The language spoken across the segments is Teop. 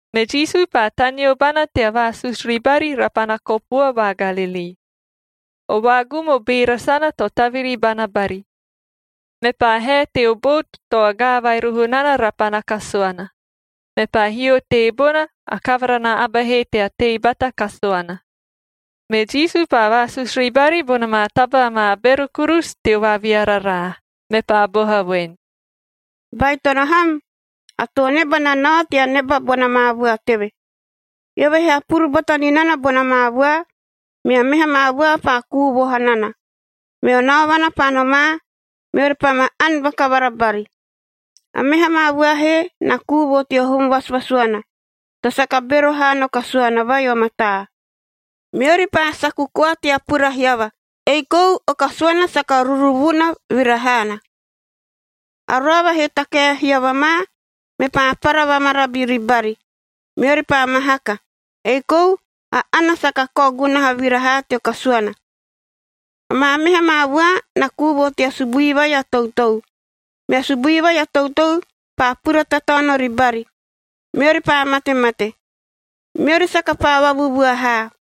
Me Jisu paa taneo bana tea vaasusu ribari rapana kopua va Galilii. O vaagum o beera sana to taviri bana bari, mepaa hae teo bout to agaa vai roho nana rapana kasuana, mepaa hio teebona, a kavara na aba he tea tei bata kasuana. Me Jisu paa vaasusu ribari bona maa taba amaa bero kurusu teo vaaviararaa, mepaa boha voen, “Baitono ham! A too neba na nao tea neba bona maa vua teve. Eove he hapuru bata ni nana bona maa vua, mea meha maa vua paa kuu vo hanana, meo naovana paa nomaa, meori paa ma ani vakavara bari. A meha maa vua he na kuu vo teo hum vasuvasuana, to saka bero haa no kasuana vai o mataa. Meori paa saku koa tea pura hiava, ei kou o kasuana saka ruruvuna vira haana. A roava he takae hiava ma, mepaa para vamarabi ribari. Meori paa mahaka, ei kou a ana saka kao gunaha vira haa teo kasuana. Amaa meha maa vua na kuu vo tea subui vai a toutou. Mea subui vai a toutou paa pura tataono ribari, meori paa matemate. Meori saka paa vavuvua haa.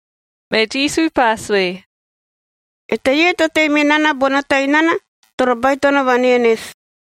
Me Jisu paa sue, “Eteie to tei me nana bono tainana toro baitono vanenesi.”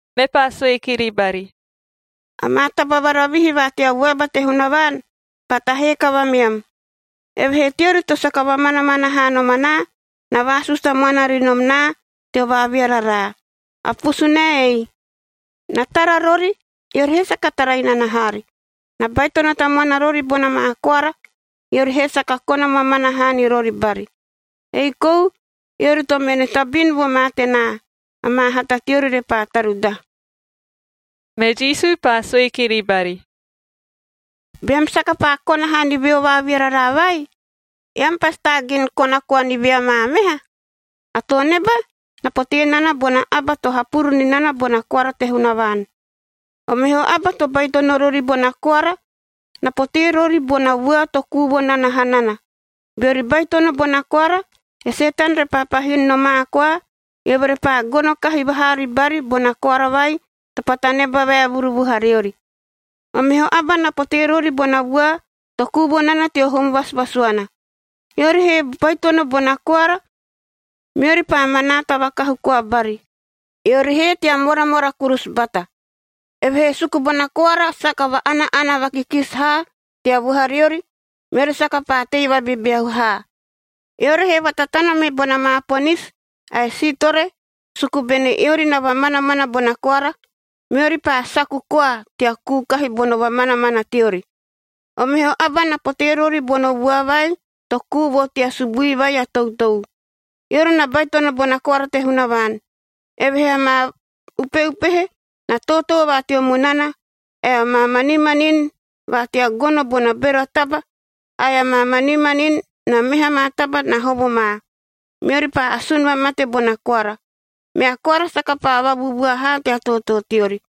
Mepaa sue kiri bari, “Amaa taba varavihi va tea vuaba te Hunavaan paa tahee kavameam. Evehee teori to saka vamanamana haa nom anaa, na vaasusu tamuana ri nom naa teo vaaviararaa. A pusunae eiei: ‘Na tara rori, eori he saka tara inana haari, na baitono tamuana rori bona maa koara, eori he saka kona mamana haa ni rori bari. Ei kou eori to mene tabin vo ma tenaa, amaa hata teori repaa tarudaha.ab’” Me Jisu paa sue kiri bari, “Beam saka paa kona haa ni veo vaaviararaa vai, eam pasi taagin kona koa ni ve amaa meha? A too neba na potee nana bona aba to hapuru ni nana bona koara te Hunavaan. O meho aba to baitono rori bona koara na potee rori bona vua to kuu vo nana hanana. Beori baitono bona koara, e Setan repaa pahin nomaa koa, eove repaa gono kahi vahaa ribari bona koara vai to paa taneba vaevuru vuhariori. O meho aba na potee rori bona vua to kuu vo nana teo hum vasuvasuana. Eori he baitono bona koara, meori paa manaata vakahu koa bari, eori he tea moramora kurusu bata. Evehee suku bona koara saka va-ana-ana vakikisi haa tea vuhariori, meori saka paa tei vabebeahu haa. Eori he vatatana me bona maa ponisi ae siitore suku bene eori na vamanamana bona koara, meori paa saku koa tea kuu kahi bono vamanamana teori. O meho aba na potee rori bona vua vai to kuu vo tea subui vai a toutou. Eori na baitono bona koara te Hunavaan, evehee amaa upeupehe na tootoo va teo munana, ae amaa manimanin va tea gono bona bero a taba, ae amaa manimanin na meha maa taba na hovo ma, meori paa asun vamate bona koara. Mea koara saka paa vavuvua haa tea tootoo teori.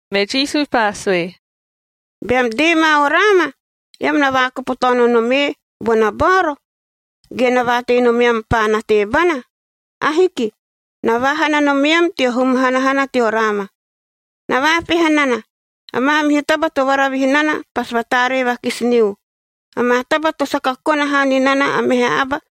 Me Jisu paa sue, “Beam dee ma o raama, eam na vaakopo taono nom ee bona baoro, ge na vaatei nomeam paana teebana? Ahiki! Na vaahana nomeam teo hum hanahana teo raama. Na vaapeha nana, a maamihu taba to varavihi nana pasi vataaree vakisi niu, amaa taba to saka kona haa ni nana a meha aba,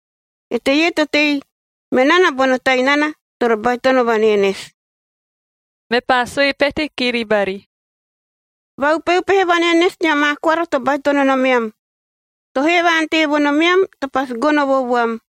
Eteie to tei me nana bono tainana toro baitono vanenesi.” Mepaa sue pete kiri bari, “Vaupeupehe vanenesi nia maa koara to baitono nomeam. To hee va-ante vo nomeam to pasi gono vo vuam,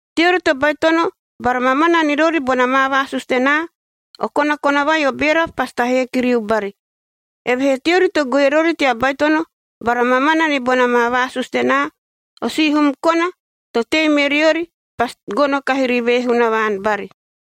Teori to baitono bara mamana ni rori bona maa vaasusu tenaa, o konakona vai o beera pasi tahee kiriu bari. Evehee teori to goe rori tea baitono bara mamana ni bona maa vaasusu tenaa, o sihum kona to tei me riori, pasi gono kahi ri ve Hunavaan bari.”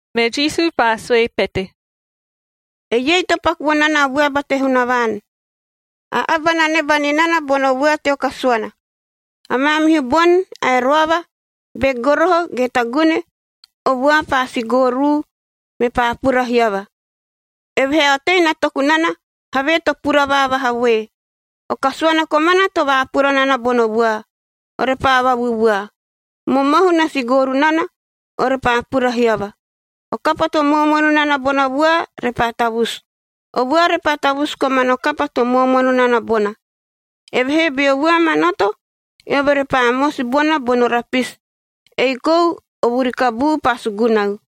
Me Jisu paa sue pete, “Eiei to paku vo nana a vuaba te Hunavaan: A aba na neba ni nana bono vua teo kasuana. A maamihu boni ae roava, be goroho ge tagune, o vua paa sigooruu, mepaa pura hiava, evehee a otei na toku nana havee to pura vaavaha voe. O kasuana komana to vaapura nana bono vua, orepaa vavuvua. Momohu na sigooru nana, orepaa pura hiava, o kapa to moomono nana bono vua repaa tavusu, o vua repaa tavusu komano kapa to moomono nana bona. Evehee beo vua manoto, eove repaa mosi bona bono rapisi, ei kou o vuri kabuu paa sugunau.”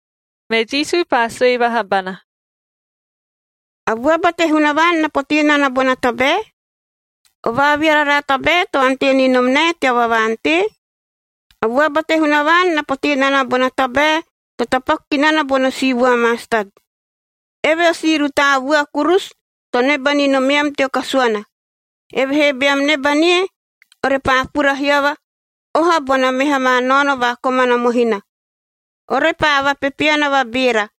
Me Jisu paa sue vaha bana, “A vuaba te Hunavaan na potee nana bona tabae? O vaaviararaa tabae to ante ni nom nae tea vavaa-ante? A vuaba te Hunavaan na potee nana bona tabae to tapaku ki nana bono si vua mastat. Eve o si rutaa vua kurusu to neba ni nomeam teo kasuana, evehee beam neba nie, orepaa pura hiava oha bona meha maa naono va komana mohina. Orepaa vapepeana vabeera,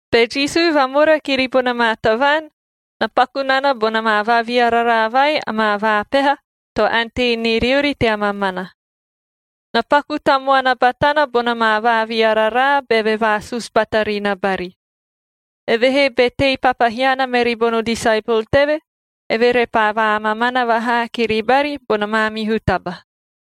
Be Jisu vamora kiri bona maa tavaan, na paku nana bona maa vaaviararaa vai amaa vaapeha to ante ni riori tea mamana. Na paku tamuana batana bona maa vaaviararaa beve vaasusu bata ri na bari. Evehee be tei papahiana meri bono disaepol teve, eove repaa vaamamana vahaa kiri bari bona maamihu taba.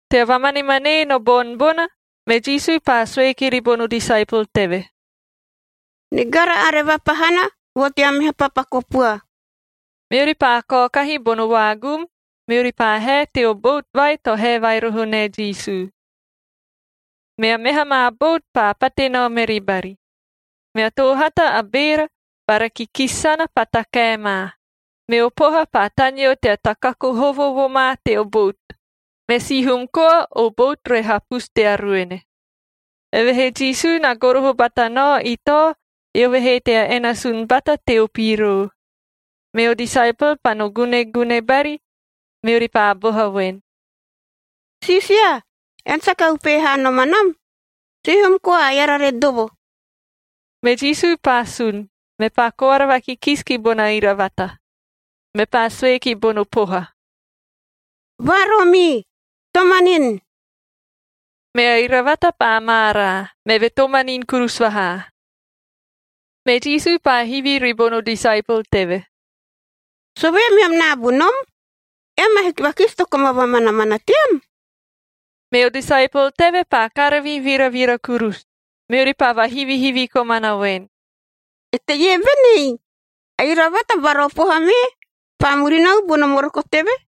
Tea vamanemanee no boni bona, me Jisu paa sue kiri bono disaepol teve, “Nigara are vapahana vo tea meha papa kopua.” Meori paa kaokahi bono vaagum, meori paa hae teo bout vai to hae vai roho nae Jisu. Mea meha maa bout paa pate nao meri bari. Mea toohata a beera bara kikisi sana paa takae ma, meo poha paa taneo tea takaku hovo vo ma teo bout, me sihum koa o bout re hapusu tea ruene. Evehee Jisu na goroho bata nao itao, eove he tea enasunf bata teo piroo. Meo disaepol paa no gunegune bari, meori paa boha voen, “Siisia! Ean saka upehe haa nom anam? Sihum koa eara re dovo.” Me Jisu paa sun, mepaa koara vakikisi ki bona iravata, mepaa sue ki bono poha, “Vaaroomii! Tomanini!” Mea iravata paa maaraa, meve tomanini kurusu vahaa. Me Jisu paa hivi ribono disaepol teve, “Sovee meam naabu nom? Eam ahiki vakisi to koma vamanamana team?” Meo disaepol teve paa karavi viravira kurusu, meori paa vahivihivi komana voen, “Eteie benei? A iravata bara o poha mee paa murinau bono moroko teve!”